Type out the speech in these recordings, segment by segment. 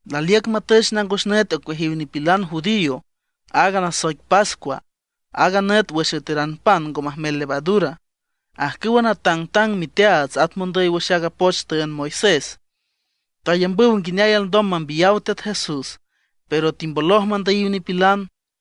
Laliüc matüch nangos nüt ocueajiw nipilan judío, aaga nasoic pascua, aaga nüt wüx üeteran pan ngo majmel levadura. Ajcüwa natangtang miteaats at mondüy wüx aaga poch tüünd Moisés tayambüw nguineay alndom mambiyaw Teat Jesús, pero timboloj mandüyiw nipilan.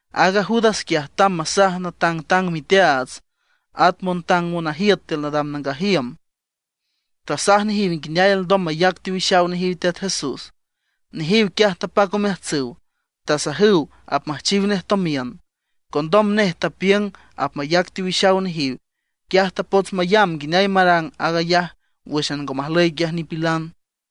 Aaga Judas quiaj tamb masaj natangtang miteaats, at montang monajiüt tiül nadam nangaj iüm, tasaj nejiw nguineay alndom mayac teowixaw nejiw Teat Jesús. Nejiw quiaj tapac omeajtsüw, tasajüw apmüjchiw nej tomiün. Condom nej tapiüng apmayac teowixaw nejiw; quiaj tapots mayamb nguineay marang aag ayaj wǘxan ngo majlüy quiaj nipilan.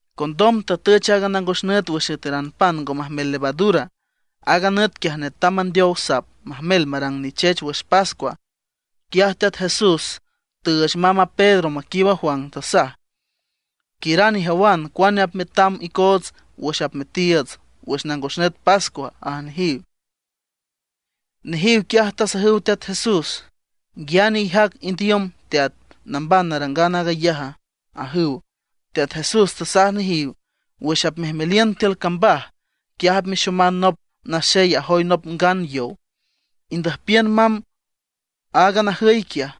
Condom tatüch a nangos nüt wüx üeteran pan ngo majmel levadura. Aaga nüt quiaj netam mandeow sap majmel marang nichech wüx pascua. Quiaj Teat Jesús tüüch mamb a Pedro maquiiüb a Juan, tasaj: ―Quiüran ijawan cuane apmetam icoots wüx apmetiiüts wüx nangos nüt pascua ―aj nejiw. Nejiw quiaj tasajüw Teat Jesús: ―¿Nguiane ijac indiüm, Teat, namban narangan aag ayaja? ―ajüw. Teat Jesús tasaj nejiw: ―Wüx apmejmeliün tiül cambaj, quiaj apmexoman nop naxey ajoy nop ngan yow. Indüjpiün mamb aaga najüy quiaj,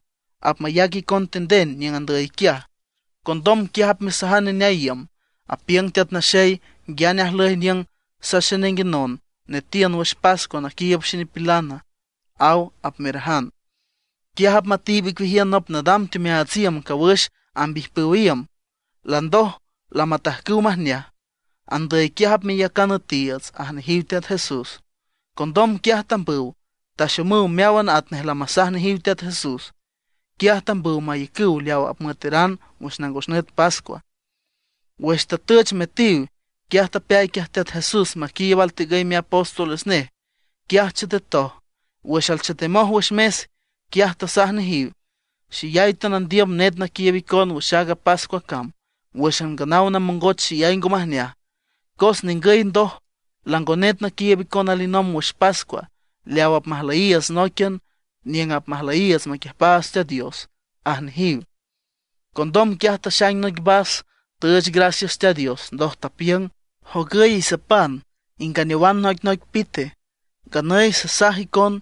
apmayac icon tinden niüng andüy quiaj. Condom quiaj apmesajan neneay iüm: “Apiüng Teat Naxey: ¿Nguiane ajlüy niüng saxejnenguenon netiün wüx pascua naquiiüb xenipilana? aw”, apmerajan. Quiaj apmatiib icueajiün nop nadam teomeaats iüm cawüx amb ijpüw iüm, landoj lamatajcüw majneaj. Andüy quiaj apmeyacan üetiiüts ―aj nejiw Teat Jesús. Condom quiaj tambüw. Taxomüw meáwan atnej lamasaj nejiw Teat Jesús. Quiaj tambüw mayacüw leaw apmüeteran wüx nangos nüt pascua. Wüx tatüch metiw, quiaj tapeay quiaj Teat Jesús maquiiüb altigüy miapóstoles nej. Quiaj chetetoj. Wüx alchetemoj wüx mes, quiaj tasaj nejiw: ―¡Xeyay teanandiüm net naquiiüb icon wüx aaga pascua cam, wǘxan nganaw namongoch xeyay ngo majneaj! Cos ningüy ndoj, lango net naquiiüb icon alinomb wüx pascua, leaw apmajlüyiiüts nóiquian niüng apmajlüyiiüts maquiüjpaats Teat Dios ―aj nejiw Teat Jesús. Condom quiaj taxaing noic vas, tüüch gracias Teat Dios, ndoj tapiüng: ―Jogüy isapan inganeowan noicnoic pite. Nganüy sasaj icon,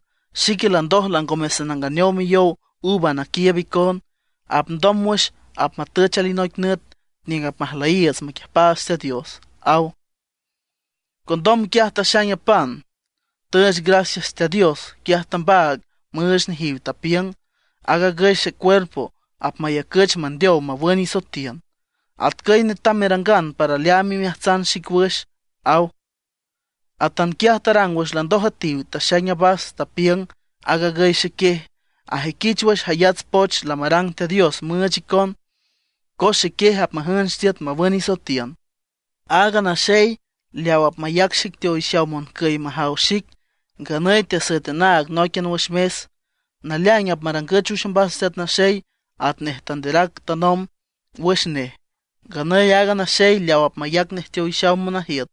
xique landoj langome sananganeow miyow uva naquiiüb icon; apndom wüx apmatüch alinoic nüt niüng apmajlüyiiüts maquiüjpaats Teat Dios ―aw. Condom quiaj taxaing a pan, tüüch gracias Teat Dios. Quiaj tambaag müüch nejiw, tapiüng: ―Aag agüy xecuerpo, apmayacüch mandeow mawün isoetiün. Atcüy netam merangan para leaam imeajtsan xic wüx ―aw. Atanquiaj tarang wüx landoj üetiw. Taxaing a vas, tapiüng: ―Aag agüy xequiej, ajüiquich wüx jayats poch lamarang Teat Dios müüch icon, cos xequiej apmajünch tiüt mawün isoetiün. ’Aaga naxey leaw apmayac xic teowixaw moncüy majaw xic, nganüy teasüet anaag nóiquian wüx mes. Naleaing apmarangüch wüx ombas Teat Naxey atnej tanderac tanomb wüx nej. ¡Nganüy aaga naxey leaw apmayac nej teowixaw monajiüt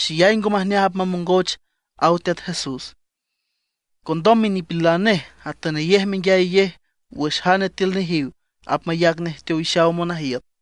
xeyay ngo majneaj apmamongoch! ―aw Teat Jesús. Condom minipilan nej atünayej menguiayayej wüx jane tiül nejiw apmayac nej teowixaw monajiüt.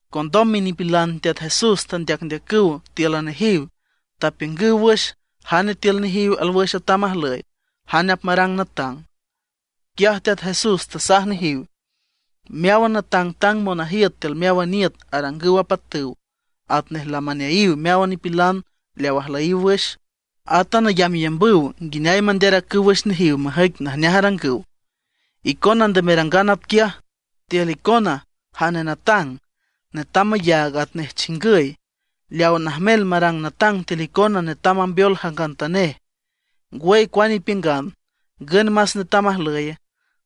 Condom minipilan Teat Jesús tandeacndeacüw tíülan nejiw, tapiüngüw wüx jane tiül nejiw alwüx atam ajlüy, jane apmarang natang. Quiaj Teat Jesús tasaj nejiw: ―Meáwan natangtang monajiüt tiül meáwan iüt arangüw apatüw atnej lamaneayiw meáwan nipilan leaw ajlüyiw wüx. Átan ayambyambüw nguineay manderacüw wüx nejiw majüic najneaj arangüw. Icona nde merangan atquiaj. Tiül icona jane natang netam mayaag atnej chingüy. Leaw najmel marang natang tiül icona netam mambeol jangantanej. Ngwüy, cuane ipiüngan, ¿ngün más netam ajlüye?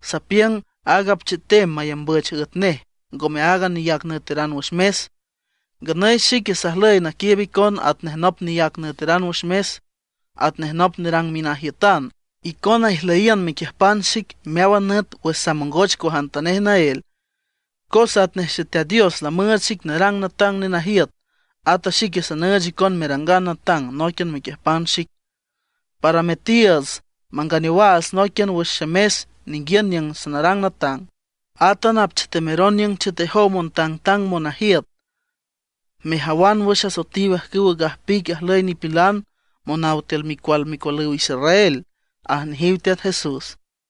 Sapiüng aaga apchetem mayambüch üet nej; ngome aaga neyac nüeteran wüx mes. Nganüy xique sajlüy naquiiüb icon atnej nop neyac nüeteran wüx mes, atnej nop nerang minajiütan. ’Icona ijlüyiün mequiüjpan xic meáwan nüt wüx samongoch cuajantanej naél. Cos atnej Xeteat Dios lamüüch xic narang natang nenajiüt, ata xique sanüüch icon merangan natang nóiquian mequiüjpan xic, para metiiüts manganeowaats nóiquian wüx xemes ninguiün niüng sanarang natang. Átan apchetemeron niüng chetejow montangtang monajiüt, mejawan wüx asoetiw ajcüwa gajpic ajlüy nipilan monaw tiül micual micualüw Israel ―aj nejiw Teat Jesús.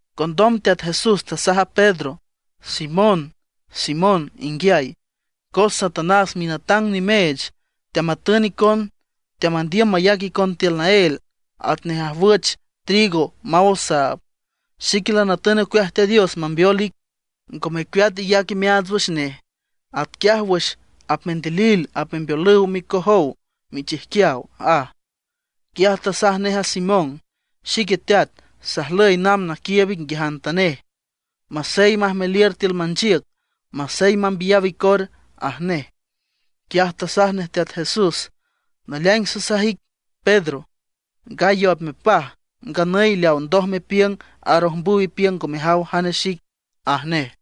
Condom Teat Jesús tasaj a Pedro: ―Simón, Simón inguiay, cos Satanás minatang nimeech teamatün icon, teamandiüm mayac icon tiül naél, atnej ajwüch trigo maw osaab. Xique lanatün ocueaj Teat Dios mambeol ic ngo mecueat iyac imeaats wüx nej, atquiaj wüx apmendilil apmembeolüw micojow michijquiaw ―aj. Quiaj tasaj nej a Simón: ―Xique teat, sajlüy namb naquiiüb ic nguiajantanej, masey majmeliür tiül manchiüc, masey mambiyaw icor ―aj nej. Quiaj tasaj nej Teat Jesús: ―Naleaing sasaj ic, Pedro, gallo apmepaj nganüy leaw ndoj mepiüng arojmbüw ipiüng ngo mejaw jane xic ―aj nej.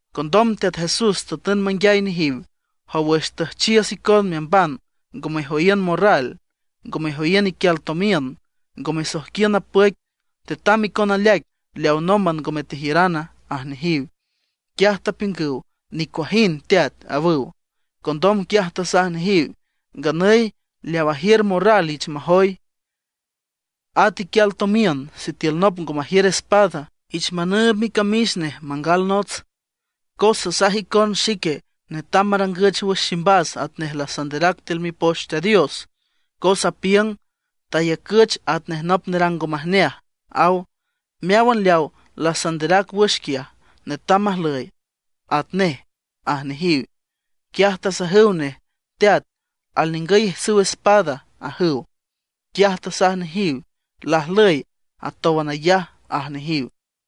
Condom Teat Jesús tatün manguiay nejiw: ―Jow wüx tüjchiüs icon meamban ngo mejoyiün morral, ngo mejoyiün iquial tomiün, ngo mesoijquiün napüic, ¿tetam icon aleaic leaw nómban ngome tejiürana? ―aj nejiw. Quiaj tapiüngüw: ―Nicuajind, Teat ―awüw. Condom quiaj tasaj nejiw: ―Nganüy, leaw ajiür morral ich majoy, at iquial tomiün. Sitiül nop ngo majiür espada, ich manüüb micamix nej mangal nots. Cos sasaj icon xique netam marangüch wüx ximbas atnej lasanderac wüx tiül Mipoch Teat Dios, cos apiüng: “Tayacüch atnej nop nerang ngo majneaj”, aw. Meáwan leawa lasanderac wüx quiaj, netam majlüy atnej ―aj nejiw. Quiaj tasajüw nej: ―Teat, alningüy ijtsüw espada ―ajüw. Quiaj tasaj nejiw: ―¡Lajlüy, atówan ayaj! ―aj nejiw.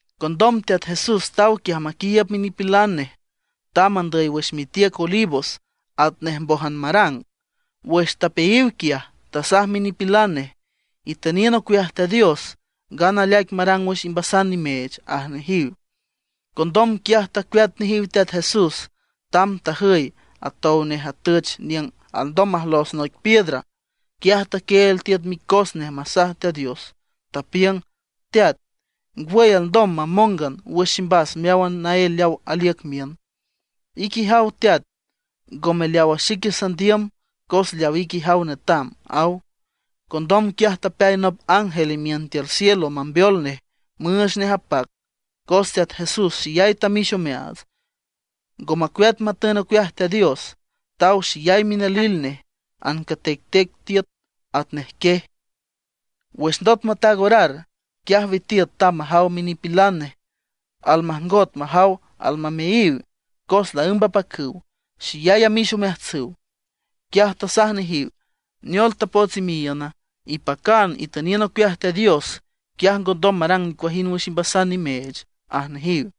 Condom Teat Jesús taw quiaj maquiiüb minipilan nej, tamb andüy wüx mitiüc Olivos atnej mbójan marang. Wüx tapeayiw quiaj, tasaj minipilan nej: ―Itüniün ocueaj Teat Dios, ngana aleaic marang wüx imbasan nimeech ―aj nejiw. Condom quiaj tacueat nejiw Teat Jesús, tamb tajüy atow nej atüch niüng alndom majlos noic piedra. Quiaj taquieel tiüt micos nej masaj Teat Dios, tapiüng: ―Teat, ngwüy alndom mamóngan wüx ximbas meáwan naél leaw aliüc miün; ique ijaw Teat, ngome leawa xique sandiüm, cos leaw ique ijaw netam ―aw. Condom quiaj tapeay nop ángel imiün tiül cielo mambeol nej, müüch nej apac. Cos Teat Jesús xeyay tamix omeaats, ngo macueat matün ocueaj Teat Dios; taw xeyay minalil nej, ancatectec tiüt atnej quiej. Wüx ndot mataag orar, quiaj witiüt tamb majaw minipilan nej. Almajngot majaw almameayiw, cos laǘmb apacüw, xeyay amix omeajtsüw. Quiaj tasaj nejiw: ―¿Neol tapots imeayiüna? ¡Ipacan, itüniün ocueaj Teat Dios, quiaj ngondom marang nicuajind wüx imbasan nimeech! ―aj nejiw.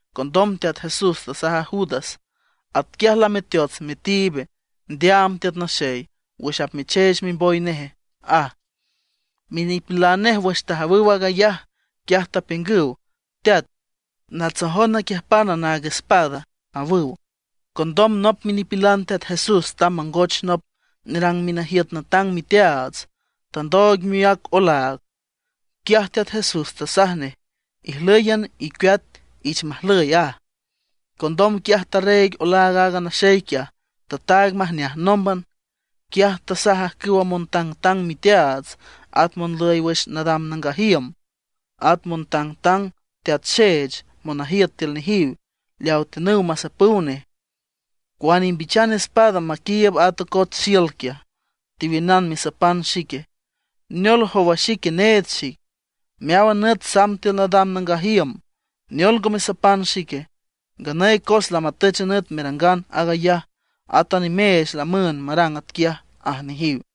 Condom Teat Jesús tasaj a Judas: ―¿Atquiaj lameteots metiib ndeaam Teat Naxeye, wüx apmecheech mimboy neje? ―aj. Minipilan nej wüx tajawüw aag ayaj, quiaj tapiüngüw: ―Teat, ¿natsojon naquiüjpan naag espada? ―awüw. Condom nop minipilan Teat Jesús tamb mangoch nop nerang minajiüt natang miteaats, tandooig miác olaag. Quiaj Teat Jesús tasaj nej: ―¡Ijlǘyan, icueat, ich majlüy! ―aj. Condom quiaj tarreeg olaag aaga naxey quiaj, tataag majneaj nómban. Quiaj tasaj ajcüwa montangtang miteaats, at monlüy wüx nadam nangaj iüm, at montangtang teat xeech monajiüt tiül nejiw, leawa tiünüw masapüw nej: ―¿Cuane imbichan espada maquiiüb a tocots xiül quiaj, tewiünana mesapan xique? ¿Neol, jowa xique need xique? Meáwan nüt samb tiül nadam nangaj iüm. ¿Neol ngo mesapan xique? Nganüy cos lamatüch a nüt merangan aag ayaj, at nimeech lamüünd marang atquiaj ―aj nejiw.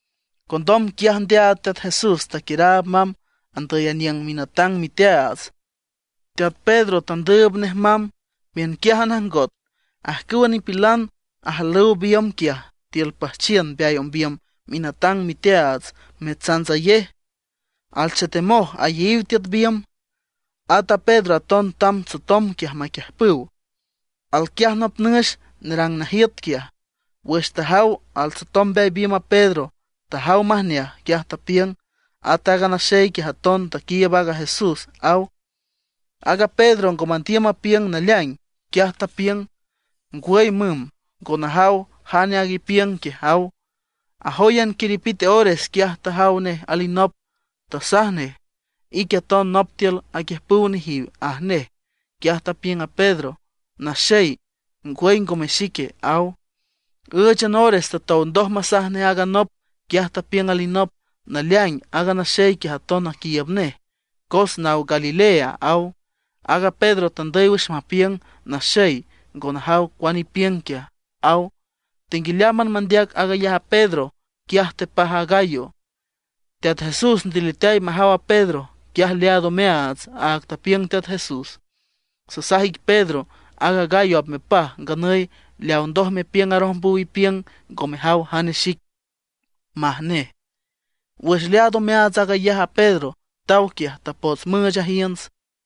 Condom quiaj ndeaad Teat Jesús, taquiüraab mamb andüy aniüng minatang miteaats. Teat Pedro tandüüb nej mamb, miünquiájan ajngot. Ajcüwa nipilan ajalüw biümb quiaj tiül püjchiün mbeay ombiüm minatang miteaats metsantsayej; alchetemoj ayeyiw tiüt biümb. At a Pedro aton tamb tsotom quiaj maquiüjpüw. Alquiaj nop nüx nerang najiüt quiaj, wüx tajaw altsotom mbeay biümb a Pedro, tajaw majneaj, quiaj tapiüng: ―At aaga naxey quiaj aton taquiiüb aaga Jesús ―aw. Aaga Pedro ngo mandiüm mapiüng naleaing, quiaj tapiüng: ―Ngwüy müm, ngo najaw jane aag ipiüng quiaj ―aw. Ajóyan quiripite ores, quiaj tajaw nej alinop, tasaj nej: ―Ique aton nop tiül aquiüjpüw nejiw ―aj nej. Quiaj tapiüng a Pedro: ―Naxey, ngwüy ngome xique ―aw. Ǘüchan ores tatow ndoj masaj nej aaga nop, quiaj tapiüng alinop: ―Naleaing, aaga naxey quiaj aton aquiiüb nej, cos naw Galilea ―aw. Aaga Pedro tandüy wüx mapiüng: ―Naxey, ngo najaw cuane ipiüng quiaj ―aw. Tenguialeámban mandeac aag ayaj a Pedro, quiaj tepaj a gallo. Teat Jesús ndiliteay majaw a Pedro. Quiaj leaad omeaats aaga tapiüng Teat Jesús: “Sasaj ic Pedro, aaga gallo apmepaj nganüy leaw ndoj mepiüng arojmbüw ipiüng ngo mejaw jane xic”, maj nej. Wüx leaad omeaats aag ayaj a Pedro, taw quiaj, tapots müüch ajiünts.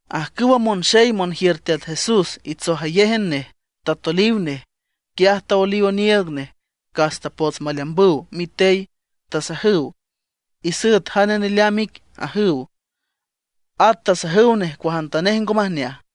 Ajcüwa monxey monjiür Teat Jesús itsojayéjan nej, tatoliw nej. Quiaj taoeliw oniiüg nej, cas tapots maleambüw mitey. Tasajüw: ―¡Isüet jane neleamb ic! ―ajüw. At tasajüw nej cuajantanej ngo majneaj.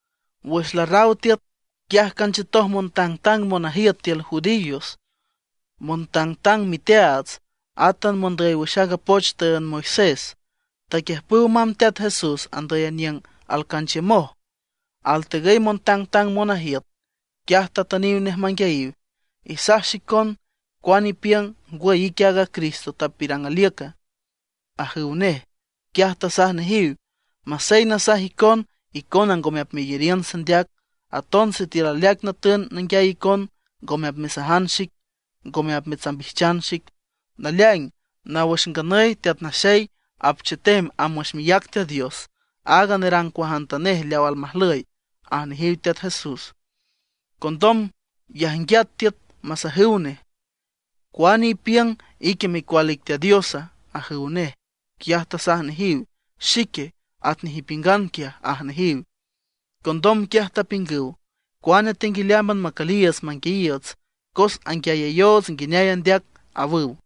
Wüx larraw tiüt, quiaj canchiütoj montangtang monajiüt tiül judíos, montangtang miteaats, átan mondüy wüx aaga poch tüünd Moisés. Taquiüjpüw mamb Teat Jesús andüy niüng alcanchiümoj altegüy montang monajiüt. Quiaj tatüniw nej manguiayiw: ―Isaj xicon, ¿cuane ipiüng, ngwüy ique aaga Cristo tapiürang aliüca? ―ajüw nej. Quiaj tasaj nejiw: ―Masey nasaj icon, icona ngome apmeyariün sandeac. Aton sitiül aleaic natün nanguiay icon, ngome apmesajan xic, ngome apmetsambijchan xic. Naleaing, naw wüx nganüy Teat Naxey apchetem amb wüx miác Teat Dios, aag nerang cuajantanej leaw almajlüy ―aj nejiw Teat Jesús. Condom yajnguiat tiüt masajüw nej: ―¿Cuane ipiüng, ique micual ic Teat Diosa? ―ajüw nej. Quiaj tasaj nejiw: ―Xique, atnej ipiüngan quiaj ―aj nejiw. Condom quiaj tapiüngüw: ―¡Cuane tenguialeámban macüliiüts manguiayiiüts, cos anguiayayoots nguineay andeac! ―awüw.